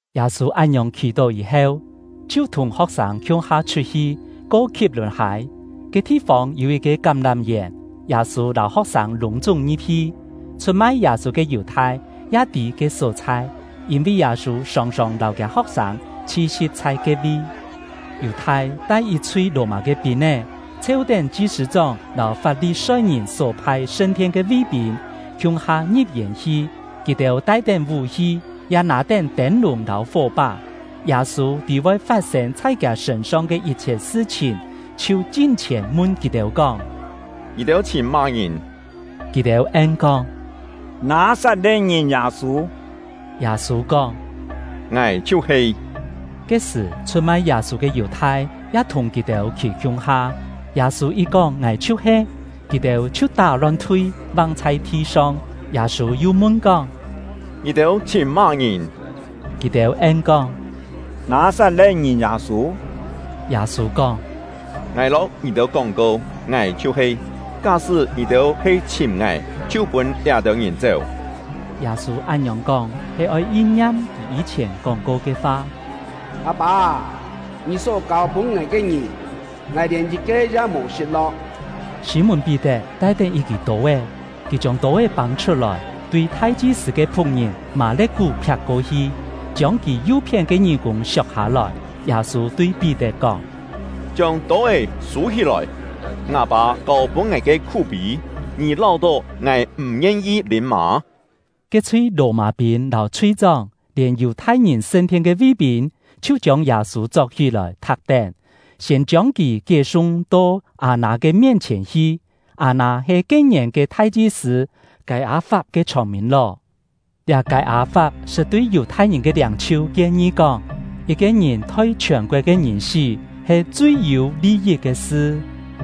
Yâ-sû án-ngiòng khì-tó yî-heu, chhiu thùng ho̍k-sâng khiung-ha chhut-hi, ko Khi̍p-lùn-hâi. Ke thi-fông yû yit-ke kám-lám-yèn, Yâ-sû lâu ho̍k-sâng lûng-chúng ngi̍p-hi. Chhut-mai Yâ-sû ke Yù-thai ya tî ke só-chhai, yîn-vi Yâ-sû sòng-sòng lâu kiâ ho̍k-sâng chhi-si̍p chhai ke-vi. Yù-thai tai yit-chhui Lò-mâ ke pîn-é, chheu-tén chi-sṳ̂-chóng lâu Fap-li-soi-ngìn só phai sṳn-thien ke ví-pîn, khiung-ha ngi̍p-yèn hi. Kì-têu tai-tén vú-hi, ya nâ-tén tên-lùng lâu fó-pá. Yâ-sû tî voi fat-sên chhai kiâ sṳ̂n-song ke yit-chhiet sṳ-chhìn, chhiu chin-chhièn mun kì-têu kóng: “Ngì-têu chhìm má-ngìn?” Kì-têu en-kóng: “Nâ-sat-le̍t-ngìn Yâ-sû.” Yâ-sû kóng: “Ngài chhiu-he.” Ke-sṳ̀, chhut-mai Yâ-sû ke Yù-thai ya thùng kì-têu khî khiung-ha. Yâ-sû yit kóng “Ngài chhiu-he”, kì-têu chhiu tá-lon-thui, vang chhai thi-song. Yâ-sû yu mun-kóng: “Ngì-têu chhìm má-ngìn?” Kì-têu en-kóng: “Nâ-sat-le̍t-ngìn Yâ-sû.” Yâ-sû kóng: “Ngài lâu ngì-têu kóng-ko, ngài chhiu-he. Ká-sṳ́ ngì-têu he chhìm ngài, chhiu pûn liá-têu ngìn chéu.” Yâ-sû án-ngiòng kóng, he oi yin-ngiam kì yî-chhièn kóng-ko ke fa: “Â-pâ â, Ngì só kâu-pûn ngài ke ngìn, ngài lièn yit-ke ya mò sṳt-lo̍k.” Sî-mùn-Pí-tet tai-tén yit-kî tô-é; kì chiông tô-é pâng-chhut-lòi, tui thai-chi-sṳ̂ ke phu̍k-ngìn Mâ-le̍t-kú phiak-ko-hi, chiông kì yu-phién ke ngí-kûng siok-hâ-lòi. Yâ-sû tui Pí-tet kóng: “Chiông tô-é sû-hí-lòi! Ngâ Pâ kâu-pûn ngài ke khú-pî, ngì láu-tó ngài m̀ ngien-yi lîm mâ?” Ke-chhui Lò-mâ-pîn lâu chhui-chóng, lièn Yù-thai-ngìn sṳn-thien ke ví-pîn chhiu chiông Yâ-sû chok-hí-lòi, thak-tén, siên chiông kì kié-sung to Â-nâ ke mien-chhièn hi; Â-nâ he ke-ngièn ke thai-chi-sṳ̂ Kâi-â-fap ke chhông-mîn-ló. Liá Kâi-â-fap sṳt tui Yù-thai-ngìn ke liâng-chhiu kien-ngi kóng, yit-ke ngìn thoi chhiòn-koet ke ngìn sí he chui yû li-yit ke sṳ.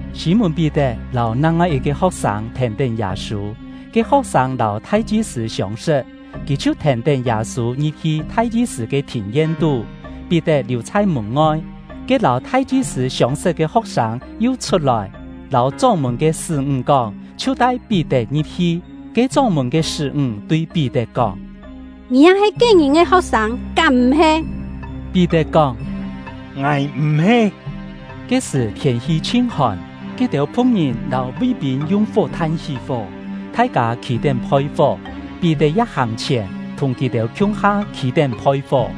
Sî-mùn-Pí-tet lâu nang-ngoi yit-ke ho̍k-sâng thèn-tén Yâ-sû; ke ho̍k-sâng lâu thai-chi-sṳ̂ siông-sṳt, kì chhiu thèn-tén Yâ-sû ngi̍p-hi thai-chi-sṳ̂ ke thìn-yen-tú. Pí-tet liù chhai mùn-ngoi. Ke lâu thai-chi-sṳ̂ siông-sṳt ke ho̍k-sâng yu chhut-lòi, lâu chóng-mùn ke sṳ́-ńg kóng, chhiu tai Pí-tet ngi̍p-hi. Ke chóng-mùn ke sṳ́-ńg tui Pí-tet kóng: “Ngì ya he ke-ngìn ke ho̍k-sâng, kám m̀-he?” Pí-tet kóng: “Ngài m̀-he!” Ke-sṳ̀ thiên-hi chhin hòn, ke-têu phu̍k-ngìn lâu ví-pîn yung fó-than hí fó, thai-kâ khî-tén phoi-fó; Pí-tet ya hàng-chhièn, thùng kì-têu khiung-ha khî-tén phoi-fó.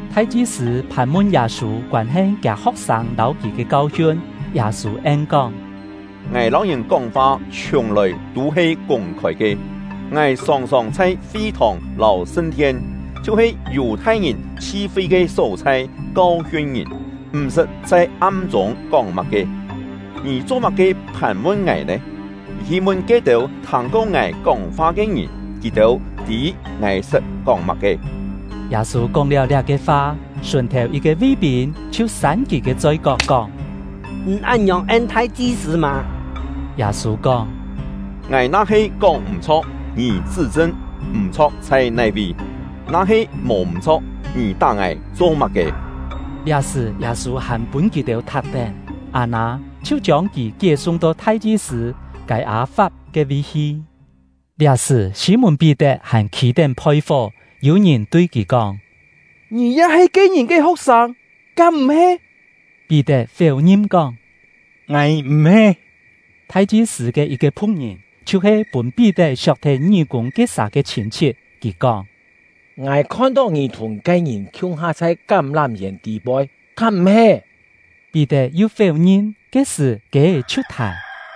Thai-chi-sṳ̂ phàn-mun Yâ-sû koân-he kiâ ho̍k-sâng lâu kì ke kau-hiun. Yâ-sû en-kóng: “Ngài lâu ngìn kóng-fa chhiùng-lòi tû he kûng-khôi ke. Ngài sòng-sòng chhai fi-thòng lâu sṳn-thien, chhiu-he Yù-thai-ngìn chhi-fi ke só-chhai kau-hiun ngìn, m̀-sṳt chhai am-chûng kóng má-ke. Ngì cho-má-ke phàn-mun ngài nè? Hi mun ke-têu thâng-ko ngài kóng-fa ke ngìn, kì-têu tî ngài sṳt kóng má-ke.” Yâ-sû kóng-liáu liá-ke fa, sùn-thèu yit-ke ví-pîn chhiu sân kì ke choi-kok, kóng: “Ngì án-ngiòng en thai-chi-sṳ̂ mâ!” Yâ-sû kóng: “Ngài na-he kóng-m̀-chho̍k, ngì chṳ́-chṳn, m̀-chho̍k chhai nai-vi! Na-he mò m̀-chho̍k, ngì tá ngài cho má-ke?” Liá-sṳ̀, Yâ-sû hàn pûn kì-têu thak-tén; Â-nâ chhiu chiông kì kié-sung to thai-chi-sṳ̂ Kâi-â-fap ke-vi hi. Liá-sṳ̀, Sî-mùn-Pí-tet hàn khî-tén phoi-fó. Yû ngìn tui kì kóng: “Ngì ya he ke-ngìn ke ho̍k-sâng, kám m̀-he?” Pí-tet féu-ngin kóng: “Ngài m̀-he!” Thai-chi-sṳ̂ ke yit-ke phu̍k-ngìn, chhiu-he pûn Pí-tet siok-thet ngí-kûng ke-sà ke chhîn-chhit, kì kóng: “Ngài khon-tó ngì thùng ke-ngìn khiung-ha chhai kám-lám-yèn tî-poi, kám m̀-he?” Pí-tet yu féu-ngin. Ke-sṳ̀, kiê-é chhiu thài.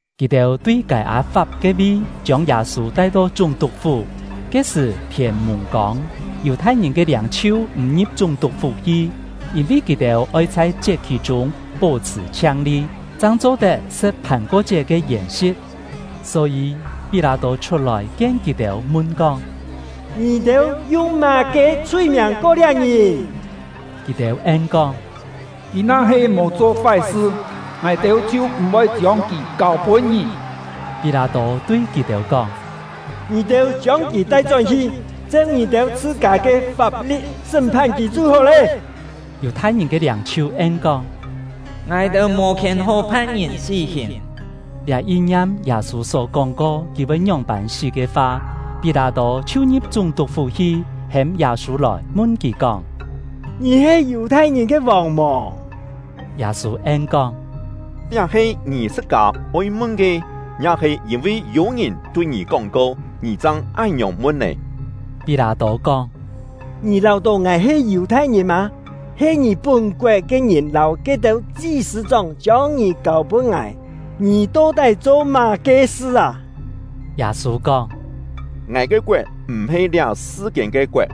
Kì-têu tui Kâi-â-fap ke-vi chiông Yâ-sû tai-to chúng-tuk-fú. Ke-sṳ̀ thiên-mùng-kông. Yù-thai-ngìn ke liâng-chhiu m̀ ngi̍p chúng-tuk-fú hi, yîn-vi kì-têu oi chhai chiet-khì-chûng pó-chhṳ̀ chhiang-li, chang cho-tet sṳ̍t Phàn-ko-chiet ke yèn-si̍t. Só-yî Pí-lâ-tô chhut-lòi kien kì-têu, mun-kóng: “Ngì-têu yung má-ke chhui-miàng ko liá ngìn?” Kì-têu en-kóng: “Kì na-he mò cho fái-sṳ, ngài-têu chhiu m̀-voi chiông kì kâu-pûn ngì.” Pí-lâ-tô tui kì-têu kóng: “Ngì-têu chiông kì tai-chón-hi, cheu ngì-têu chhṳ-kâ ke fap-li̍t sṳ́m-phan kì chhiu hó lé.” Yù-thai-ngìn ke liâng-chhiu en-kóng: “Ngài-têu mò khièn hó phan ngìn sí-hìn.” (Liá yin-ngiam Yâ-sû só kóng-ko, kì voi ngióng-pân sí ke fa.) Pí-lâ-tô chhiu ngi̍p chúng-tuk-fú hi, hêm Yâ-sû lòi, mun kì kóng: “Ngì he Yù-thai-ngìn ke vòng mò?” Yâ-sû en-kóng: “Liá he ngì chhṳ-kâ oi mun ke, ya-he yîn-vi yû-ngìn tui ngì kóng-ko, ngì chang án-ngiòng mun nè?” Pí-lâ-tô kóng: “Ngì láu-tó ngài he Yù-thai-ngìn mâ? He ngì pún-koet ke ngìn lâu ke-têu chi-sṳ̂-chóng chiông ngì kâu-pûn ngài. Ngì to-tái cho má-ke sṳ â?” Yâ-sû kóng: “Ngài ke koet m̀-he liá sṳ-kiên ke koet;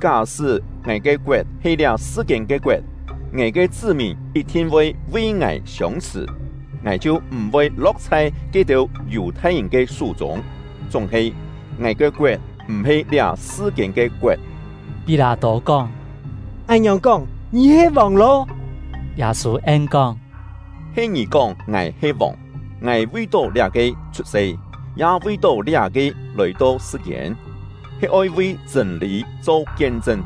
ká-sṳ́ ngài ke koet he liá sṳ-kiên ke koet, ngài ke chṳ́-mìn yit-thin voi vi ngài siông-chhṳ̀, ngài chhiu m̀-voi lo̍k chhai ke-têu Yù-thai-ngìn ke sú-chûng. Chúng-he, ngài ke koet m̀-he liá sṳ-kiên ke koet!” Pí-lâ-tô kóng: “Án-ngiòng kóng, ngì he vòng lô?” Yâ-sû en-kóng: “He ngì kóng ngài he vòng. Ngài vi-tó liá-ke chhut-se, ya vi-tó liá-ke lòi-to sṳ-kiên, he oi vi chṳ̂n-lî cho kien-chṳn.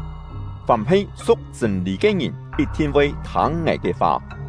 Fàm he su̍k chṳ̂n-lî ke ngìn yit-thin voi thâng ngài ke fa.”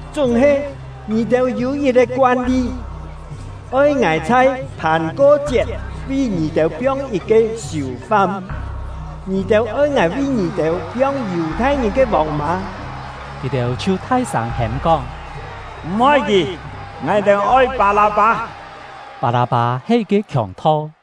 Chúng-he ngì-têu yû yit-ke koan-li, oi ngài chhai Phàn-ko-chiet vi ngì-têu piong yit-ke siù-fam. Ngì-têu oi ngài vi ngì-têu piong Yù-thai-ngìn ke vòng mâ?” Kì-têu chhiu thai-sâng hêm-kóng: “M̀-oi kì! Ngài-têu oi Pâ-lâ-pâ!” (Pâ-lâ-pâ he yit-ke khiòng-tho.)